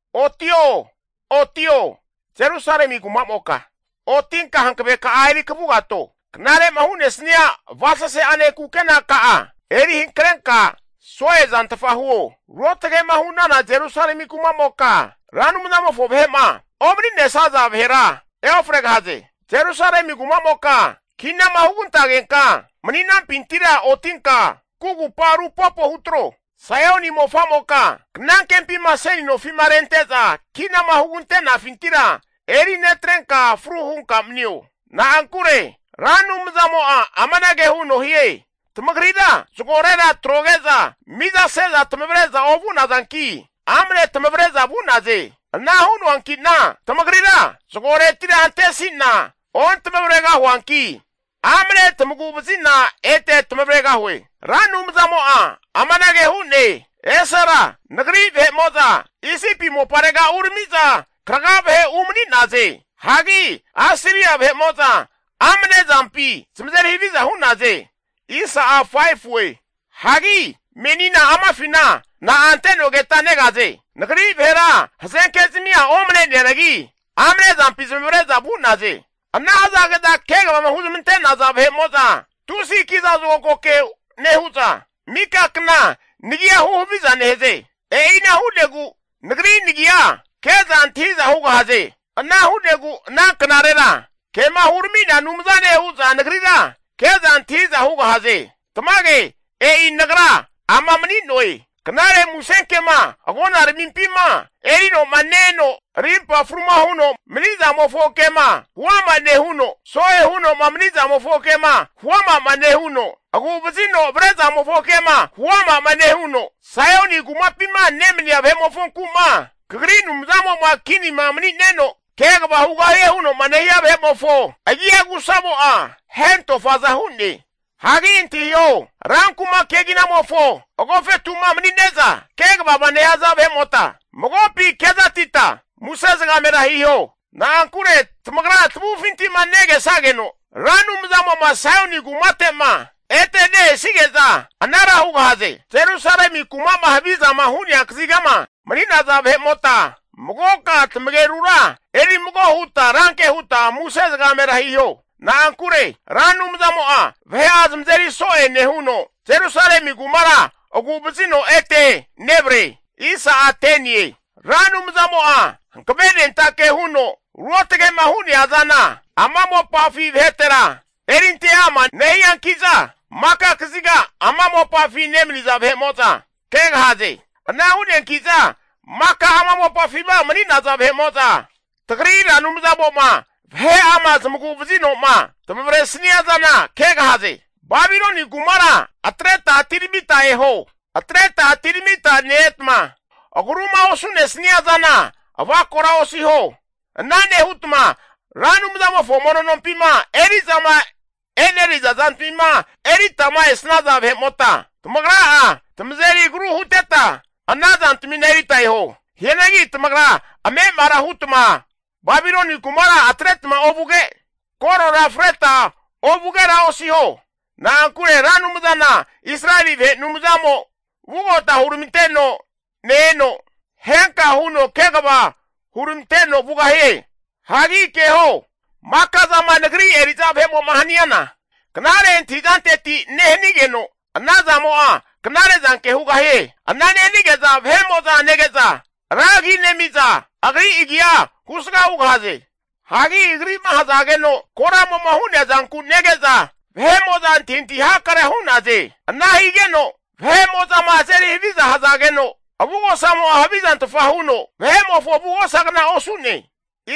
Otio, Otio Jerusalemi kumamoka otinka hankaveka'a eri kavugato. Knare'ma hu'nesnia avasase'ane kukenaka'a eri hankrenka so'e zantfa huo. Ruotage'ma hu'nana Jerusalemi kumamoka Ra Anumzamofo vahe'ma omaninesaza vahera eofregahaze. Jerusalemi kumamoka kinama hugantagenka mani'nampintira otinka kugupa rupopo hutro. Saioni mofa'moka knankempima seni nofi'ma rente'za kinama hugante'nafintira eri netrenka fru hunka manio. Na'ankure Ra Anumzamo'a amanage huno hie, Tamagrira zagorera atroge'za mizase'za tamavre'za ovu'nazanki, amne tamavre'za vu'naze. Ana hu'neanki'na tamagrira zagoretira antesi'na ontamavregahuanki, amane tamagu'vazi'na ete tamavregahue. Ra Anumzamo'a amanage hu'ne. Esera nagri vahe'mo'za Isipi moparega urami'za kraga vahe umani'naze. Hagi Asiria vahe'mo'za amane zampi zamazeri haviza hu'naze. Hagi menina amafina na'a ante'nogeta negaze? Nagri vahera hazenkezmia omane'neanagi amane zampi zamavare'za vu'naze. Ana hazage'za kegavama hunezmantaza vahe'mo'za tusi kiza zokago ke nehu'za, mika kna nagia huhaviza nehaze. E'ina hu'negu Nagri nagia ke'za antahiza hugahaze. Ana hu'negu ana knarera kema hurami'nea Anumzane hu'za Nagrira ke'za antahiza hugahaze. Tamage e'i Nagra ama mani'noe. Knare musenkema agonaramimpima erinoma ne-eno rimpa fruma huno manizamofo ke'ma huama nehuno, so'e huno'ma manizamofo kema huama'ma nehuno, agu'vazino avrezamofo kema huama'ma nehuno, Saioni kumapima nemania vahe'mofonku'ma kagri Anumzamo'ma kinima mani'neno kegava hugahiema huno'ma nehia vahe'mofo agia agusamo'a hentofaza hu'ne. Hagi antahiho, ran kuma keginamofo agofetu'ma mani'neza kegavama nehaza vahe'mota, magoka kezatita muse zagamera hiho. Na'ankure tamagra tamavufinti'ma nege'sageno Ra Anumzamo'ma Saioni kumate'ma ete ne-esige'za anara hugahaze. Jerusalemi kuma'ma havizama hu'nea kazigama mani'naza vahe'mota, magoka tamagerura eri mago huta ranke huta muse zagamera hiho. Na'ankure Ra Anumzamo'a vahe'a zamazeri so'e nehuno, Jerusalemi kumara agu'vazino ete nevare. Ra Anumzamo'a hankavenentake huno ruotge'ma hu'nea azana ama mopafi vahetera erinte ama nehianki'za, maka kaziga ama mopafi nemaniza vahe'mo'za kegahaze. Ana hu'neanki'za maka ama mopafima mani'naza vahe'mo'za, tagri Ra Anumzamo'ma vahe'ama zamagu vazino'ma zamavaresnia zana kegahaze. Babiloni kumara atreta atiramita eho, atreta atiramita ne-etma, agruma osu'nesnia zana avakora osiho. Ana nehutma Ra Anumzamofo mono nompima eri'zama e'neriza zantamina eritama esnaza vahe'mota, tamagra'a tamazeri agru huteta ana zantamina erita eho. Hianagi tamagra ame'amara hutma Babiloni kumara atretma vuge, korora freta vugera osiho. Na'ankure Ra Anumzana Israeli vahe Anumzamo vugota huramanteno ne-eno, ehenka huno kegava huramanteno vugahie. Hagi keho, maka zama nagri eri'za vahe'mo'ma haniana, knare antahizanteti nehanigeno, anazamo'a knare zanke hugahie. Ana nehanige'za vahe'mo'za nege'za ra agi nemiza, agri agia husga hugahaze. Hagi agri'ma ahazageno koramo'ma hu'nea zanku nege'za vahe'mo'za anthintahi hakarea hu'naze. Ana higeno vahe'mo'zama azeri haviza hazageno, avugosamo'a havizantfa huno vahe'mofo avugosagnara osu'ne.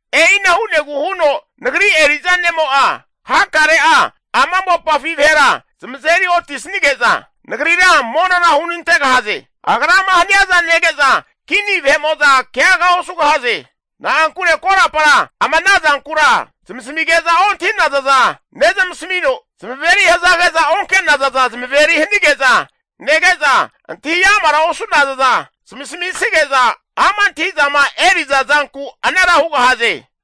E'ina hu'negu huno Nagri eri'za nemo'a hakare'a ama mopafi vahera zamazeri otisanige'za Nagrira monora hunantegahaze. Agrama haniaza nege'za kini vahe'mo'za keaga osugahaze. Na'ankure korapara ama ana zankura zamasamige'za ontahi'naza za nezamasamino, zamaveri hazage'za onke'nazaza zamaveri hanige'za nege'za, antahi amara osu'nazaza zamasamige'za ama' antahi'zama eri'za zanku anara hugahaze.